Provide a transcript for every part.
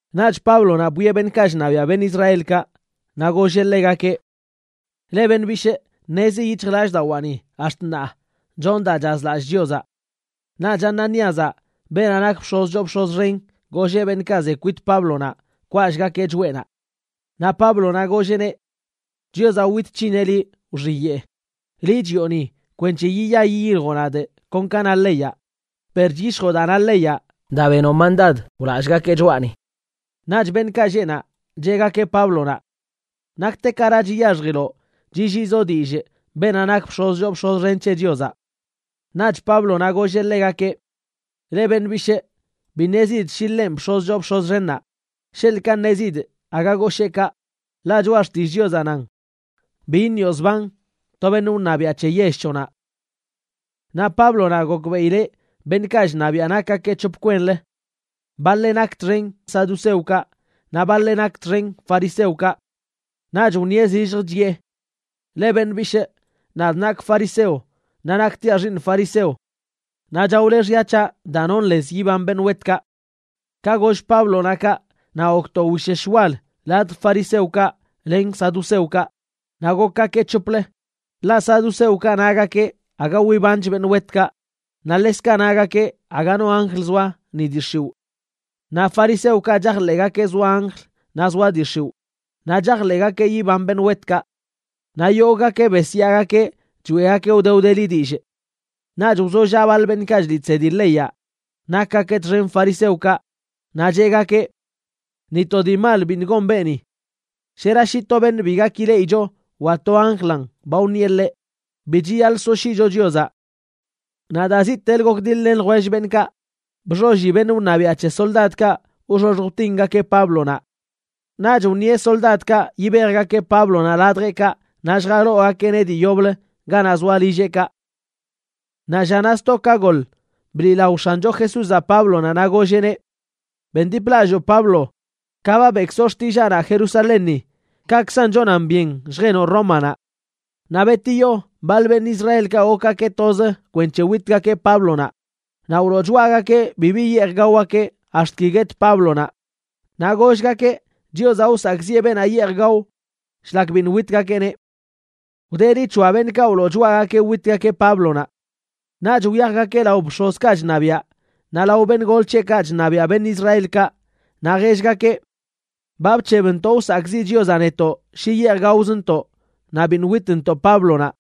Naꞌch Páblonaꞌ bwieꞌ beṉꞌkaꞌ chṉabiaꞌ beṉꞌ Israelkaꞌ naꞌ golleꞌ ḻegakeꞌ: ―Leꞌ beṉꞌ bishꞌ, ṉezi yic̱hjlallꞌdawaani ax̱t ṉaa chonꞌ daa chazlallꞌ Chiozaꞌ. Naꞌch Ananíazaꞌ, beenaꞌ nak bx̱oz choo bx̱oz xen, golleꞌ beṉꞌkaꞌ ze kwit Páblonaꞌ kwallꞌgakeꞌ choꞌenaꞌ. Naꞌ Páblonaꞌ golleꞌneꞌ: ―¡Chiozaꞌ wit c̱hineꞌ liꞌ, wxiyeꞌ! Liꞌ chiꞌoni kwenc̱he yiya yiyiljoꞌ nadꞌ kon ka na leyaꞌ, per chyishjoꞌ daa na leyaꞌ daa benoꞌ mandad wlallꞌgakeꞌ choꞌani. Naꞌch beṉꞌkaꞌ lleꞌ naꞌ, cheꞌgakeꞌ Páblonaꞌ: ―¿Naktekara chiyaxjiloꞌ chilliizoꞌ dillꞌ beenaꞌ nak bx̱oz choo bx̱en c̱he Chiozaꞌ? Naꞌch Páblonaꞌ golleꞌ ḻegakeꞌ: ―Leꞌ beṉꞌ bishꞌ, bi ṉezidꞌ shi ḻenꞌ bx̱oz choo bx̱oz xennaꞌ. Sheḻꞌkaꞌ ṉezidꞌ, aga goshee kaꞌ, ḻaꞌ Choꞌa Xtillꞌ Chiozaꞌ nan: “Bi iṉioꞌ zban to beṉꞌ wṉabiaꞌ c̱he yell c̱hoꞌnaꞌ.” Naꞌ Páblonaꞌ gokbeꞌileꞌ beṉꞌkaꞌ chṉabiaꞌ nakgakeꞌ c̱hop kwenlə. Baḻeꞌ nak txen saduceokaꞌ naꞌ baḻeꞌ nak txen fariseokaꞌ. Naꞌch wṉieꞌ zillj chiꞌe: ―Leꞌ beṉꞌ bishꞌ, nadꞌ nakꞌ fariseo naꞌ naktiaꞌ xiiṉ fariseo. Naꞌ chaole xya c̱haꞌ daa nonꞌ lez yiban beṉꞌ wetkaꞌ. Ka goll Páblonaꞌ kaꞌ naꞌ gok to wishesh wal ladj fariseokaꞌ len saduceokaꞌ. Naꞌ gokgakeꞌ c̱hoplə. Ḻaꞌ saduceokaꞌ nagakeꞌ aga wibanch beṉꞌ wetkaꞌ, naꞌ ḻekzkaꞌ nagakeꞌ aga no anjl zoa ni dii x̱iwꞌ. Naꞌ fariseokaꞌ chajḻeꞌgakeꞌ zoa anjl naꞌ zoa dii x̱iwꞌ naꞌ chajḻeꞌgakeꞌ yiban beṉꞌ wetkaꞌ. Naꞌ yogꞌgakeꞌ besyaagakeꞌ choeꞌgakeꞌ wde wdeli dillꞌ. Naꞌch wzollaꞌ baḻ beṉꞌkaꞌ chliꞌ chsedi leyaꞌ nakgakeꞌ txen fariseokaꞌ, naꞌ cheꞌgakeꞌ: ―Ni to dii mal biṉꞌ gon beeni. Shera shi to beṉꞌ bi gak ileꞌicho wa to anjlanꞌ ba wṉieꞌ ḻeꞌ. Bi chiyaḻꞌ soshyiꞌcho Chiozaꞌ. Naꞌ daa ziꞌtelə gokdiḻ-len ljwell beṉꞌkaꞌ, bxolli beṉꞌ wṉabiaꞌ c̱he soldadkaꞌ wxoxj wtingakeꞌ Páblonaꞌ. Naꞌch wṉieꞌ soldadkaꞌ yibejgakeꞌ Páblonaꞌ ladjeꞌkaꞌ naꞌ lljaloogakeꞌneꞌ dii yoblə ganaꞌ zoa lilleꞌkaꞌ. Naꞌ llanaꞌ sto ka goḻ, bliꞌlao X̱ancho Jesúzaꞌ Páblonaꞌ naꞌ golleꞌneꞌ: ―Bendiplalloo Pablo, ka ba beꞌkzoꞌ xtillaanaꞌ Jerusalénni, kaꞌkzan chonan byen lljenoꞌ Rómanaꞌ. Naꞌ betiyo baḻ beṉꞌ Israelkaꞌ gokgakeꞌ toz kwenc̱he witgakeꞌ Páblonaꞌ, naꞌ wloo choꞌagakeꞌ bibi yeej gaogakeꞌ ax̱t ki guet Páblonaꞌ, naꞌ gollgakeꞌ Chiozaꞌ wsakꞌziꞌe beenaꞌ yeej gao shlak biṉꞌ witgakeꞌneꞌ. Wdeli c̱hoa beṉꞌkaꞌ wloo choꞌagakeꞌ witgakeꞌ Páblonaꞌ. Naꞌch wyajgakeꞌ lao bx̱ozkaꞌ chṉabiaꞌ naꞌ lao beṉꞌ gol c̱heꞌkaꞌ chṉabiaꞌ beṉꞌ Israelkaꞌ naꞌ jellgakeꞌ: ―Ba bc̱hebntoꞌ wsakꞌziꞌ Chiozaꞌ netoꞌ shi yeej gaozntoꞌ naꞌ biṉꞌ witntoꞌ Páblonaꞌ.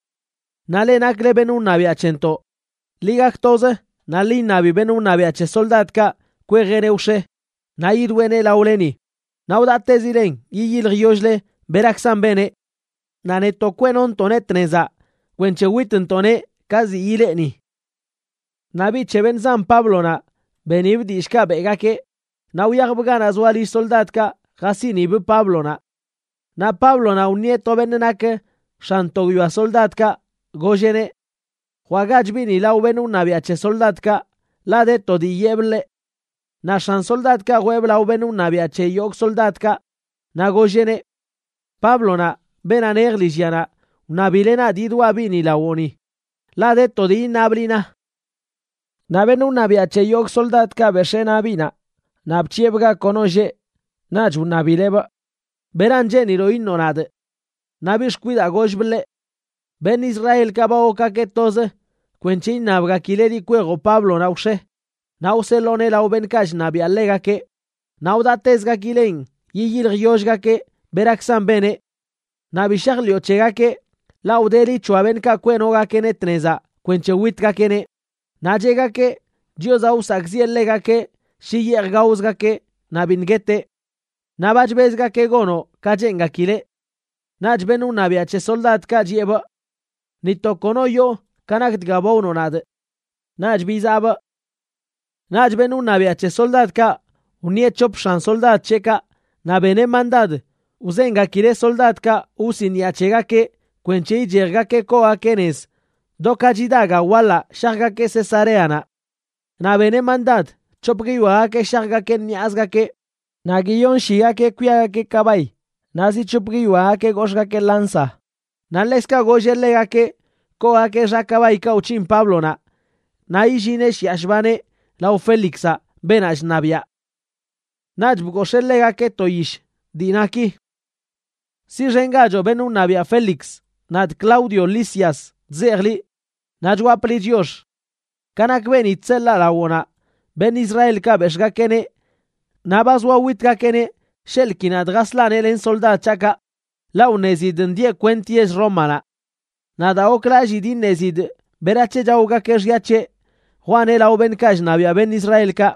Naꞌ leꞌ nakle beṉꞌ wṉabiaꞌ c̱hentoꞌ, ḻi gak toz naꞌ ḻi iṉabi beṉꞌ wṉabiaꞌ c̱he soldadkaꞌ kwejeꞌneꞌ wx̱e naꞌ yidweeneꞌ laoleni, naꞌ wdaꞌtezilen yiyiljyoll-le berakzan beneꞌ. Naꞌ netoꞌ kweꞌnontoꞌneꞌ tnezaꞌ kwenc̱he witntoꞌneꞌ ka ziꞌ ilee ni. Naꞌ biꞌ c̱he beṉꞌ zan Páblonaꞌ benibꞌ dillꞌkaꞌ beꞌgakeꞌ, naꞌ wyajbꞌ ganaꞌ zoa lill soldadkaꞌ jasiꞌnibꞌ Páblonaꞌ. Naꞌ Páblonaꞌ wṉieꞌ to beṉꞌ nak x̱an to guiyoa soldadkaꞌ, golleꞌneꞌ: ―Jwaꞌgach biꞌni lao beṉꞌ wṉabiaꞌ c̱he soldadkaꞌ, ḻaꞌ de to dii yeꞌbꞌ ḻeꞌ. Naꞌ x̱an soldadkaꞌ jweebꞌ lao beṉꞌ wṉabiaꞌ c̱he yogꞌ soldadkaꞌ, naꞌ golleꞌneꞌ: ―Páblonaꞌ, beenaꞌ nej lillyanaꞌ, wṉabileꞌ nadꞌ yidwaꞌ biꞌni lawoꞌni, ḻaꞌ de to dii iṉabꞌ liꞌ na. Naꞌ beṉꞌ wṉabiaꞌ c̱he yogꞌ soldadkaꞌ bex̱ee naꞌ biꞌnaꞌ, naꞌ bc̱hiꞌebꞌ ga kono lleꞌ. Naꞌch wṉabileꞌbꞌ: ―¿Beran cheeniloꞌ iṉoꞌ nadꞌ? Naꞌ biꞌ xkwidaa gollbꞌ ḻeꞌ: ―Beṉꞌ Israelkaꞌ ba gokgakeꞌ toz kwenc̱he iṉabgakileꞌ liꞌ kwejoꞌ Páblonaꞌ wx̱e naꞌ wseḻooneꞌ lao beṉꞌkaꞌ chṉabiaꞌ ḻegakeꞌ, naꞌ wdaꞌtezgakileꞌn yiyiljyollgakeꞌ berakzan beneꞌ. Naꞌ bi shajḻiꞌo c̱hegakeꞌ, ḻaꞌ wdeli c̱hoa beṉꞌkaꞌ kweꞌnogakeꞌneꞌ tnezaꞌ kwenc̱he witgakeꞌneꞌ, naꞌ cheꞌgakeꞌ Chiozaꞌ wsakꞌziꞌe ḻegakeꞌ shi yeej gaozgakeꞌ naꞌ biṉꞌ gueteꞌ. Naꞌ ba chbezgakeꞌ gonoꞌ ka cheengakileꞌ. Naꞌch beṉꞌ wṉabiaꞌ c̱he soldadkaꞌ chiꞌebꞌ: ―Ni to kono yoo ka nak dga ba wnoꞌ nadꞌ. Naꞌch bizaꞌbꞌ. Naꞌch beṉꞌ wṉabiaꞌ c̱he soldadkaꞌ wṉieꞌ c̱hop x̱an soldad c̱heꞌkaꞌ naꞌ beneꞌ mandad wzengakileꞌ soldadkaꞌ wsiniꞌa c̱hegakeꞌ kwenc̱he ichejgakeꞌ koogakeꞌ nez do ka chida ga waḻaꞌ shajgakeꞌ Cesareanaꞌ. Naꞌ beneꞌ mandad c̱hop guiyoagakeꞌ shajgakeꞌ ṉiꞌazgakeꞌ, naꞌ giyonshigakeꞌ kwiagakeꞌ kabay naꞌ zi c̱hop guiyoagakeꞌ gox̱ꞌgakeꞌ lanza. Naꞌ ḻekzkaꞌ golleꞌ ḻegakeꞌ koogakeꞌ xa kabaykaꞌ wc̱hin Páblonaꞌ naꞌ illineꞌ shiꞌa shbaneꞌ lao Félixaꞌ, beenaꞌ chṉabiaꞌ. Naꞌch bgox̱ee ḻegakeꞌ to yish dii na ki: “Siꞌxengachoꞌ beṉꞌ wṉabiaꞌ Félix, nadꞌ Claudio Lisias chzejꞌ liꞌ, naꞌ chwapꞌ liꞌ chiox. Ka nak beeni chseḻaa lawoꞌnaꞌ, beṉꞌ Israelkaꞌ bex̱ꞌgakeꞌneꞌ naꞌ ba zoa witgakeꞌneꞌ sheḻꞌ ki nadꞌ jaslaꞌneꞌ len soldad c̱haꞌkaꞌ, ḻaꞌ wṉezidꞌ ndieꞌ kwent yell Rómanaꞌ. Naꞌ daa goklallidꞌ iṉezidꞌ berac̱he chaogakeꞌ xya c̱heꞌ, jwaaneꞌ lao beṉꞌkaꞌ chṉabiaꞌ beṉꞌ Israelkaꞌ.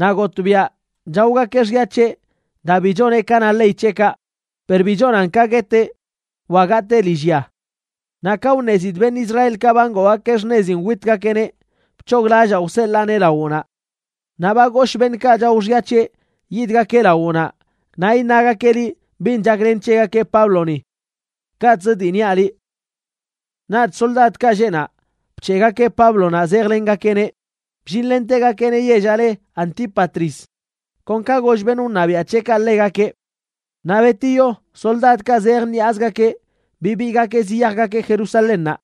Naꞌ gotꞌbiaꞌ chaogakeꞌ xya c̱heꞌ daa bi choneꞌ ka na ley c̱heꞌkaꞌ, per bi chonan ka gueteꞌ wa gatee lillya. Naꞌ ka wṉezidꞌ beṉꞌ Israelkaꞌ ba ngoogakeꞌ xṉezin witgakeꞌneꞌ, bc̱hoglallaa wseḻaaneꞌ lawoꞌnaꞌ. Naꞌ ba goshꞌ beṉꞌkaꞌ chao xya c̱heꞌ yidgakeꞌ lawoꞌnaꞌ naꞌ iṉagakeꞌ liꞌ bin chaklen c̱hegakeꞌ Pábloni. Kaꞌtz dii niaꞌ liꞌ.” Naꞌch soldadkaꞌ lleꞌ naꞌ bc̱heꞌgakeꞌ Páblonaꞌ zejlengakeꞌneꞌ, bllinlentegakeꞌneꞌ yellaꞌ le Antípatris kon ka goll beṉꞌ wṉabiaꞌ c̱heꞌkaꞌ ḻegakeꞌ. Naꞌ betiyo, soldadkaꞌ zej ṉiꞌazgakeꞌ bibiigakeꞌ ziyajgakeꞌ Jerusalénnaꞌ.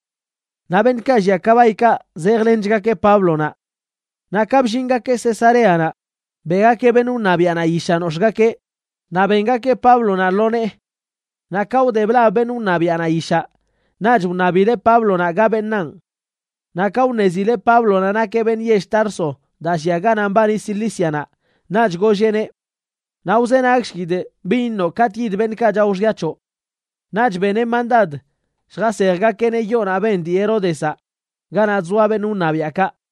Naꞌ beṉꞌkaꞌ llia kabaykaꞌ zejlenchgakeꞌ Páblonaꞌ. Naꞌ ka bllingakeꞌ Cesareanaꞌ, beꞌgakeꞌ beṉꞌ wṉabiaꞌnaꞌ yishaꞌ nox̱ꞌgakeꞌ naꞌ bengakeꞌ Páblonaꞌ lo nee. Naꞌ ka wde blab beṉꞌ wṉabiaꞌnaꞌ yishaꞌ, naꞌch wṉabileꞌ Páblonaꞌ ga beṉaan. Naꞌ ka wṉezileꞌ Páblonaꞌ nakeꞌ beṉꞌ yell Tarso, daa llia ganaꞌ mbani Cilícianaꞌ, naꞌch golleꞌneꞌ: ―Naꞌ wzenagshkidꞌ bin iṉoꞌ katꞌ yid beṉꞌkaꞌ chao xya c̱hoꞌ. Naꞌch beneꞌ mandad lljasejgakeꞌneꞌ yoonaꞌ ben dii Heródezaꞌ, ganaꞌ chzoa beṉꞌ wṉabiaꞌkaꞌ.